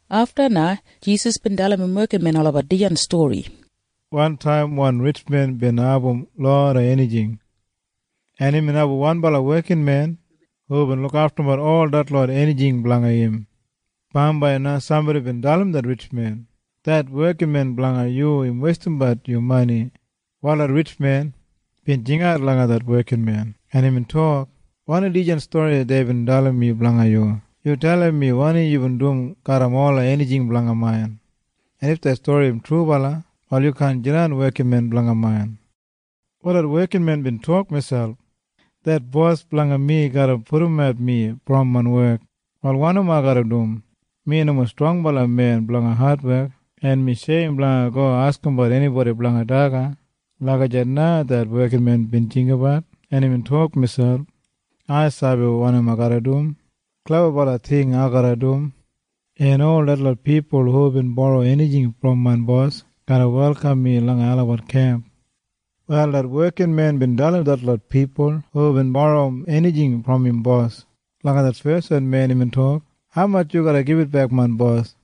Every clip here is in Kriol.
Afta na Jisas bin dalim im wekinmen olabat dijan stori, “Wantaim wan ritjmen bin abum loda enijing, en imbin abum wanbala wekinmen hubin lukaftumbat ol detlot enijing blanga im. “Bambai na sambodi bin dalim det ritjmen, ‘Det wekinmen blanga yu im weistimbat yu mani.’ “Wal det ritjmen bin jingat langa det wekinmen, en imbin tok, ‘Wanim dijan stori deibin dalim mi blanga yu? Yu dalim mi wanim yubin dum garram ola enijing main, en if det stori im trubala, wal yu kaan jidan wekinmen blanga main.’ “Wal det wekinmen bin tok miselp, ‘Det bos blanga mi garra pudumat mi brom main wek. Wal wanim ai garra dum? Mi nomo strongbala men blanga adwek, en mi sheim blanga go askimbat enibodi blanga daga.’ Lagijat na det wekinmen bin jinggabat, en imbin tok miselp, ‘Ai sabi wanim ai garra dum. Klebabala ting ai garra dum, en ol detlot pipul hubin boro enijing brom main bos garra welkam mi langa olabat kemp.’ “Wal det wekinmen bin dalim detlot pipul hubin boro enijing brom im bos. Langa det feswan men imbin tok, ‘Haumatj yu garra gibitbek main bos?’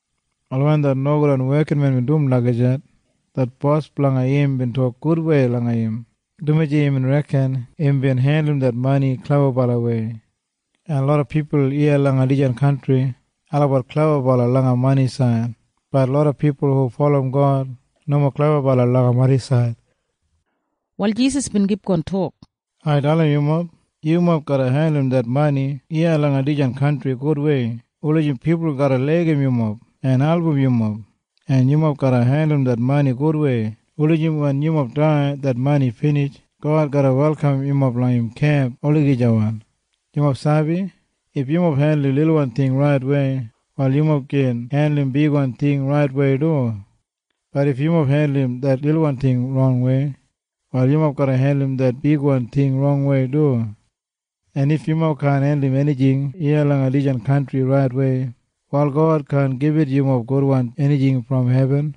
“Wal wen det nogudwan wekinmen bin dum lagijat, det bos blanga im bin tok gudwei langa im, dumaji imbin reken imbin hendulum det mani klebabalawei. En loda pipul iya langa dijan kantri olabat klebabala langa manisaid. Bat loda pipul hu bulurrum God nomo klebabala langa manisaid.” Wal Jisas bin kipgon tok, “Ai dalim yumob. Yumob garra hendulum det mani iya langa dijan kantri gudwei wulijim pipul garra laigim yumob en album yumob, en yumob garra hendulum det mani gudwei wulijim wen yumob dai en det mani binij, God garra welkam yumob langa im kemp olagijawan. “Yumob sabi? If yumob hendulum lilwan ting raitwei, wal yumob gin hendulum bigwan ting raitwei du. Bat if yumob hendulum det lilwan ting rongwei, wal yumob garra hendulum det bigwan ting rongwei du. En if yumob kaan hendulum enijing iya langa dijan kantri raitwei, wal God kaan gibit yumob gudwan enijing brom hebin.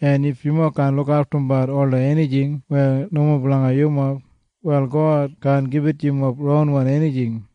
En if yumob kaan lukaftum ola enijing weya nomo blanga yumob, wal God kaan gibit yumob ronwan enijing.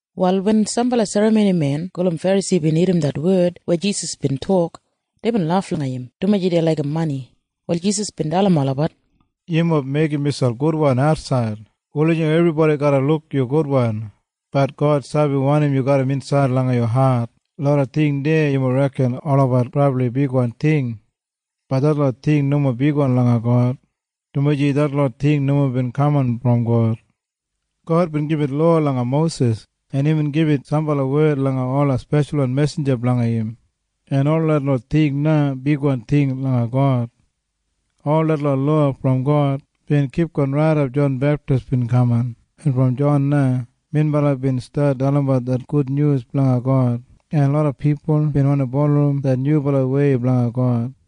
Wal wen sambala serramonimen gulum Ferasi bin irrim det wed weya Jisas bin tok, deibin laf langa im, dumaji dei laigim mani. Wal Jisas bin dalim olabat, “Yumob meigim miselp gudwan atsaid wulijim ebribodi garra luk yu gudwan. Bat God sabi wanim yu garram insaid langa yu hat. Loda ting deya yumob reken olabat brabli bigwan ting. Bat detlot ting nomo bigwan langa God, dumaji detlot ting nomo bin kaman brom God. “God bin gibit lowa langa Mosis, en imbin gibit sambala wed langa ola speshalwan mesinja blanga im, en ol detlot ting na bigwan ting langa God. Ol detlot lowa brom God bin kipgon raidap Jon Beptis bin kaman, en brom Jon na melabat bin stat dalimbat det gudnyus blanga God, en loda pipul bin wandi bulurrum det nyubalawei blanga God.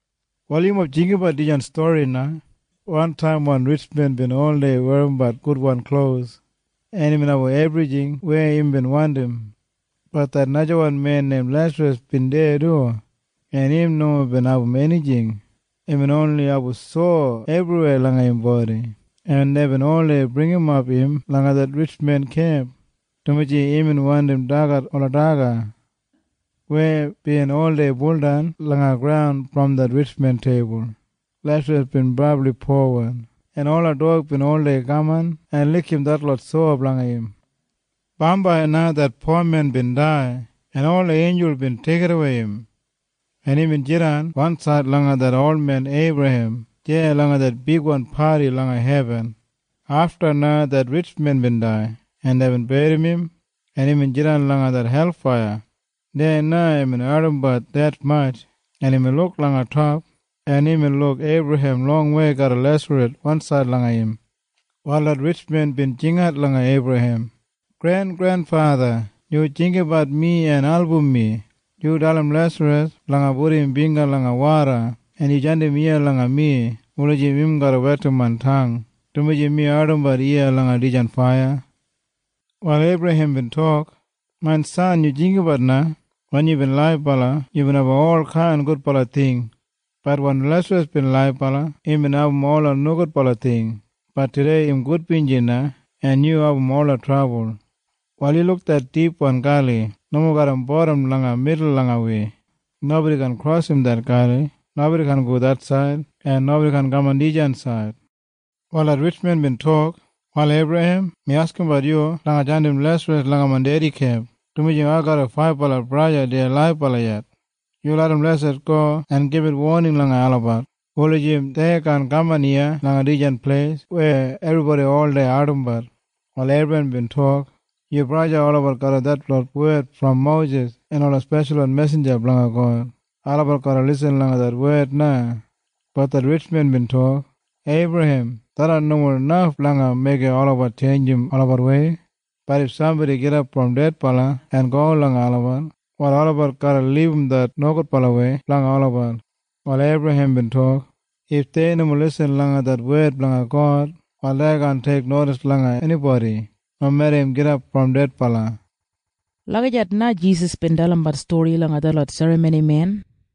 “Wal yumob jinggabat dijan stori na. Wantaim wan ritjmen bin oldei werrimbat gudwan klos, en imbin abum ebrijing weya imbin wandim. Bat det najawan men neim Lesaras bin deya du, en im nomo bin abum enijing. Imbin oni abum sowa ebriweya langa im bodi, en deibin oldei bringimap im langa det ritjmen kemp, dumaji imbin wandi dagat ola daga weya bin oldei buldan langa graun brom det ritjmen teibul. Lesaras bin brabli powan, en ola dog bin oldei kaman en likim detlot sowa blanga im. “Bambai na det pomen bin dai, en ola einjul bin deigidawei im, en imbin jidan wansaid langa det olmen Eibrahem deya langa det bigwan padi langa hebin. “Afta na det ritjmen bin dai, en deibin berrim im, en imbin jidan langa det helfaiya. Deya na imbin ardimbat detmatj, en imbin luk langa top, en imbin luk Eibrahem longwei garram Lesaras wansaid langa im. “Wal det ritjmen bin jingat langa Eibrahem, ‘Grengrenfatha, yu jinggabat mi en album mi. Yu dalim Lesaras blanga pudum im bingga langa woda, en yu jandim im iya langa mi wulijim im garra wetim main tang, dumaji mi ardimbat iya langa dijan faiya.’ “Wal Eibrahem bin tok, ‘Main san, yu jinggabat na. Wen yubin laibala, yubin abum olkain gudbala ting. Bat wen Lesaras bin laibala, imbin abum ola nogudbala ting. Bat tudei im gudbinji na en yu abum ola trabul. Wal yu luk det dipwan gali nomo garram bodam langa midul langa wi. Nobodi kaan krosim det gali. Nobodi kaan go det said, en nobodi kaan kaman dijan said.’ “Wal det ritjmen bin tok, ‘Wal Eibrahem, mi askimbat yu blanga jandim Lesaras langa main dedi kemp, dumaji ai garram faibala braja deya laibala yet. Yu larram Lesaras go en gibit woning langa olabat wulijim dei kaan kaman iya langa dijan pleis weya ebribodi oldei ardimbat.’ “Wal Eibrahem bin tok, ‘Yu braja olabat garram detlot wed brom Mosis en ola speshalwan mesinja blanga God. Olabat garra lisin langa det wed na.’ “Bat det ritjmen bin tok, ‘Eibrahem, tharran nomo naf blanga meigim olabat tjeinjim olabatwei. Bat if sambodi gidap brom dedbala en go langa olabat, wal olabat garra libum det nogudbalawei blanga olabat.’ “Wal Eibrahem bin tok, ‘If dei nomo lisin langa det wed blanga God, wal dei kaan teiknodis langa enibodi nomeda im gidap brom dedbala.’” Lagijat na Jisas bin dalimbat stori langa detlot serramonimen.